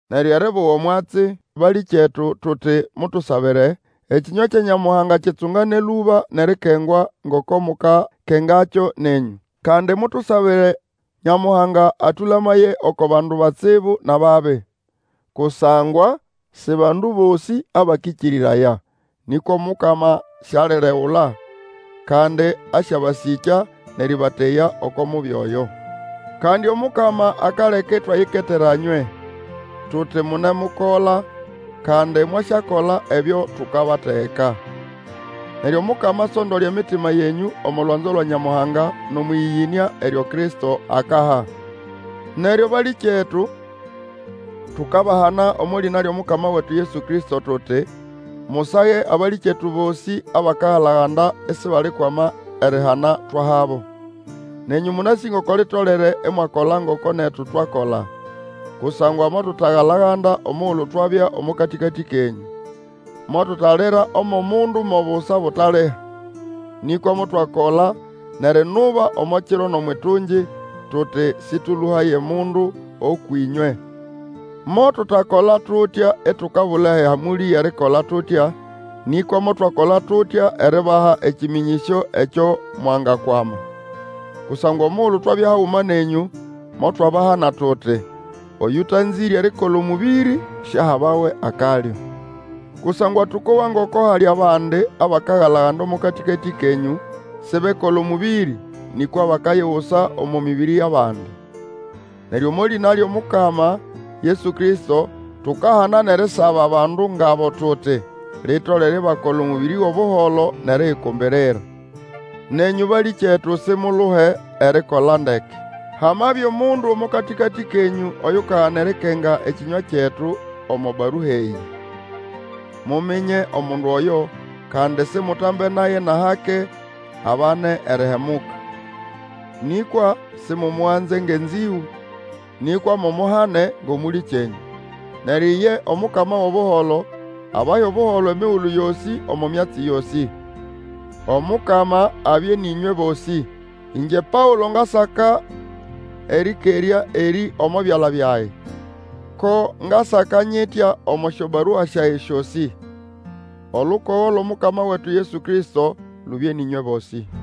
Neryo eribuga omwatsi, balĩkyetu, tuti, mutusabire, ekĩnywa kya Nyamuhanga kitsungane lũba nʼerikengwa, ngoko mukakengakyo nenyũ. Kandi mutusabire Nyamuhanga atũlamaye oko bandu batsibu nʼababi. Kusangwa si bandu bosĩ abakĩkĩrĩraya. Nĩkwa Omukama sialiregula, kandi asyabasĩkya nʼerĩbateya oko Mubi Oyo. Kandi Omukama akaleka itwayiketera nywe, tuti munemukola, kandi mwasyakola ebyo tukabategeka. Neryo Omukama asondole emitima yenyũ omo lwanzo lwa Nyamuhanga nʼomwʼĩyĩyĩnĩa eryo Kristo akaha. Neryo balĩkyetu, tukabahana omo lĩna lyʼomukama wetu Yesu Kristo tuti, musage abalĩkyetu bosĩ abakagala-ganda isibalikwama erihana twahabo. Nenyũ mũnasĩ ngoko litolere imwakola ngoko netu twakola; kusangwa motutagalaganda omugulu twabya omo katĩkatĩ kenyũ. Motutalira omwʼomundu mo busa butaliha, nĩkwa motwakola nʼerinuba omo kiro nʼomwʼitungi, tuti sĩtũlũhaye mundu ũkwʼĩnywe. Motutakola tutya itukabula ehamũlĩ yʼerikola tutya, nĩkwa motwakola tutya eribaha ekĩmĩnyĩsyo ekyo mwangakwama. Kusangwa omugulu twabya haguma nenyũ, motwabahana tuti, Oyũtanzĩre erikola omũbĩrĩ, siahabawe akalyo. Kusangwa tũkowa ngoko hali abandi abakagala-ganda omo katĩkatĩ kenyũ, sibekola omũbĩrĩ, nĩkwa bakayigusa omo mĩbĩrĩ yʼabandi. Neryo omo lĩna lyʼomukama Yesu Kristo, tukahana nʼerisaba bandu ngʼabo, tuti, Litolere ibakola omũbĩrĩ gʼobuholo nʼeriyikumbirira. Nenyũ, balĩkyetu, simuluhe erikola ndeke. Hamabya omundu omo katĩkatĩ kenyũ oyukagana erikenga ekĩnywa kyetu omo barua eyĩ. Muminye omundu oyo, kandi simutambe naye nʼahake, abane erihemuka. Nĩkwa simumuganze ngʼenzĩgũ, nĩkwa mumuhane ngʼomũlĩkyenyũ. Neryo iye Omukama wʼobuholo, abahe Obuholo emigulu yosĩ omo myatsi yosĩ. Omukama abye nʼĩnywe bosĩ! Ĩngye Paũlo ngasaka erĩkerya erĩ omo byala byage. Ko ngasaka nyitya omo syobarua syage syosĩ. Olukogo lwʼOmukama wetu Yesu Kristo lubye nʼĩnywe bosĩ.